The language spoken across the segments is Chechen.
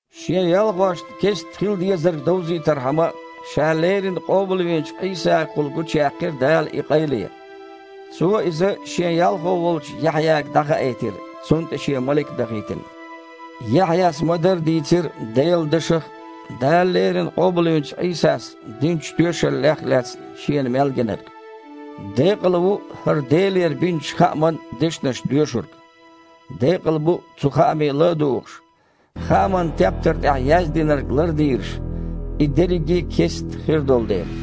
Шен ялхошна кестта хила дезарг довзийтархьама, Ша леррина къобалвинчу Іийсагахула гучуяьккхира Дала и къайле. Цо иза Шен ялхо волчу Яхьъяга дІахаийтира, цунна тІе Шен малик а дахийтина. Яхьъяс ма-дарра дийцира Делан дашах а, Дала леррина къобалвинчу Іийсас динчу тоьшаллех а лаьцна шена мел гинарг. Декъала ву хІара Делера бинчу хааман дешнаш доьшург. Декъала бу, цу хааме ла а дугІуш, хааман тептар тІехь яздинарг лардийраш, и дерриге а кестта хир долу дела.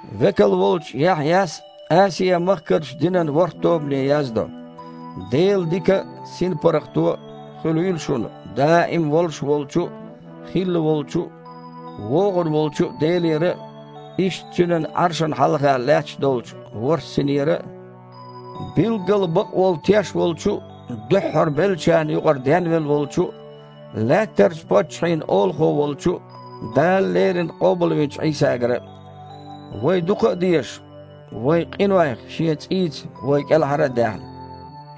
Векал волчу Яхьъяс Асиа-махкарчу динан ворхІ тобане яздо: Делан дика а, синпаргІато а хуьлийла шуна даим волуш волчу а, хилла волчу а, вогІун волчу Делера а, иштта Цуьнан Іаршана хьалха лаьтташ долчу ворхІ синера а, билггала бакъволу теш волчу а, дуьххьара беллачарна юкъара денвелла волчу а, лаьттарчу паччахьийн Олахо волчу а Дала леррина къобалвинчу Іийсагара а. Вай дукха а дезаш, вайн къинойх Шен цІийца вай кІелхьара а даьхна,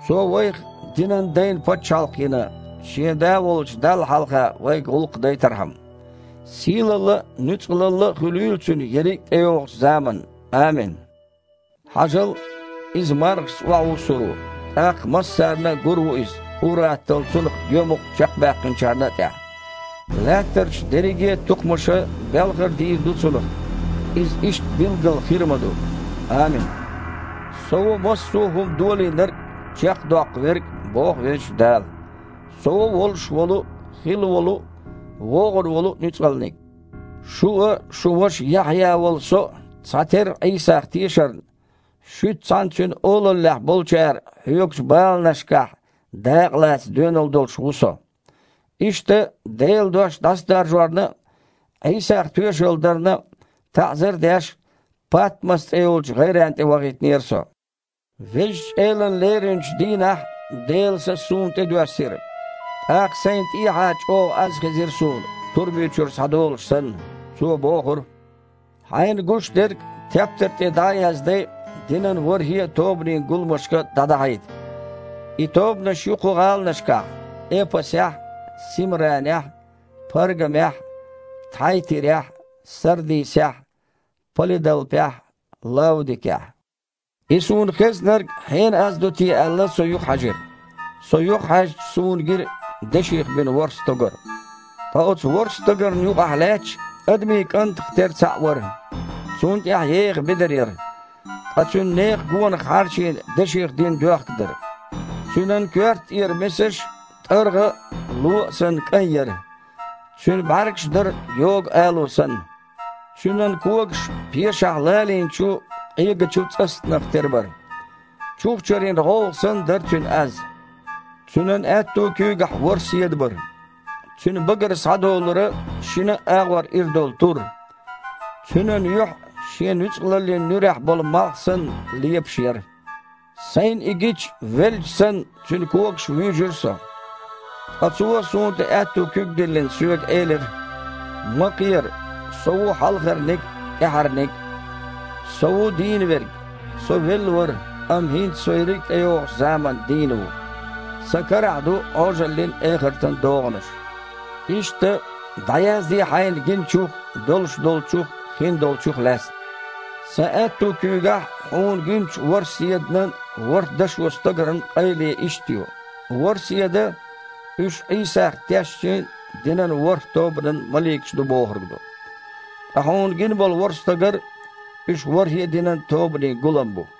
Цо вайх динан дайн пачхьалкх йина, Шен Да волчу Далла хьалха вайга гІуллакх дайтархьама. Сийлалла а, нуьцкъалалла а хуьлийла Цуьнан ерриг а тІейогІучу заманна. Амин. Хьажал, Иза мархашца охьавуссур ву, тІаккха массарна гур а ву Иза, ур-атталла Цунах гоьмукъ чекхбаьккхинчарна а тІехь. Лаьттарчу дерриге а тукхамаша белхар дийр ду Цунах. Иза иштта билггал хир а ма ду! Амин! «Со ву массо а хІума Долийнарг а, чекхдоккху Верг а, – боху Везачу Дала. – Со ву волуш волу а, хилла волу а, вогІун волу а Нуьцкъалниг». Шу а, шун ваша Яхьъя волу со а цхьатерра Іийсах тешарна, шуьца цхьаьна Цуьнан олаллехь болчара хьоьгучу баланашкахь дакъа лаца доьналла долуш ву со. Иштта, Делан дош дІасадаржорна а, Іийсах тоьшалла дарна а, таІзар а деш, Патмас цІе йолчу гІайренна тІе вахийтинера со. Везачу Элана леринчу дийнахь Делан Са суна тІе доьссира, тІаккха сайна тІехьа чІогІа аз хезира суна, турби чуьра схьадолуш санна. Цо бохура: «Хьайна гушдерг тептар тІе дІа а яздай, динан ворхІе а тобанийн гуламашка дІадахьийта. И тобанаш ю хІокху гІаланашкахь: Эпасехь, Симранехь, Паргамехь, Тхьайтирехь, Сардисехь, Палидалпехь, Лаудикехь». И суна хезнарг хьенан аз ду те аьлла, со юхахьаьжира. Со юхахьаьжча, суна гира деших бина ворхІ стогар. Ткъа оцу ворхІ стогарна юкъахь лаьтташ «адамийн кІантах тера цхьаъ» вара. Цунна тІехь еха бедар яра, ткъа цуьнан некхана гонах хьарчийна деших дина доьхка дара. Цуьнан коьрта тІера месаш, тІаргІа а, ло а санна, кІайн яра. БІаьргаш а дара Цуьнан йогу алу санна. Цуьнан когаш пешахь лалийначу, къегачу цІастанах тера бара. Чухчарин гІовгІа санна дара Цуьнан аз. Цуьнан аьтту куьйгахь ворхІ седа бара. Цуьнан багара схьадолура шинна а агІор ира долу тур. Цуьнан юьхь а, шен нуьцкъалаллин нуьрехь болу малх санна, лепаш яра. Сайна и гича, велча санна, Цуьнан когашка вуьйжира со. Ткъа Цо, суна тІе аьтту куьг а диллина, соьга элира: «Ма кхера. Со ву Хьалхарниг а, ТІаьххьарниг а. Со ву дийна Верг. Со велла вара, амма хІинца Со ерриг а тІейогІучу заманна дийна ву. Сан карахь ду Іожаллин а, эхартан а догІанаш. Иштта, дІаязде хьайна гиначух а, долуш долчух а, хиндолчух а лаьцна. Сан аьтту куьйгахь хьуна гиначу ворхІ седанан а, ворхІ дашо стогаран а къайле иштта ю: ворхІ седа – уьш Іийсах тешначийн динан ворхІ тобанан маликаш ду бохург ду. Ткъа хьуна гина болу ворхІ стогар – уьш ворхІе а динан тобанийн гулам бу».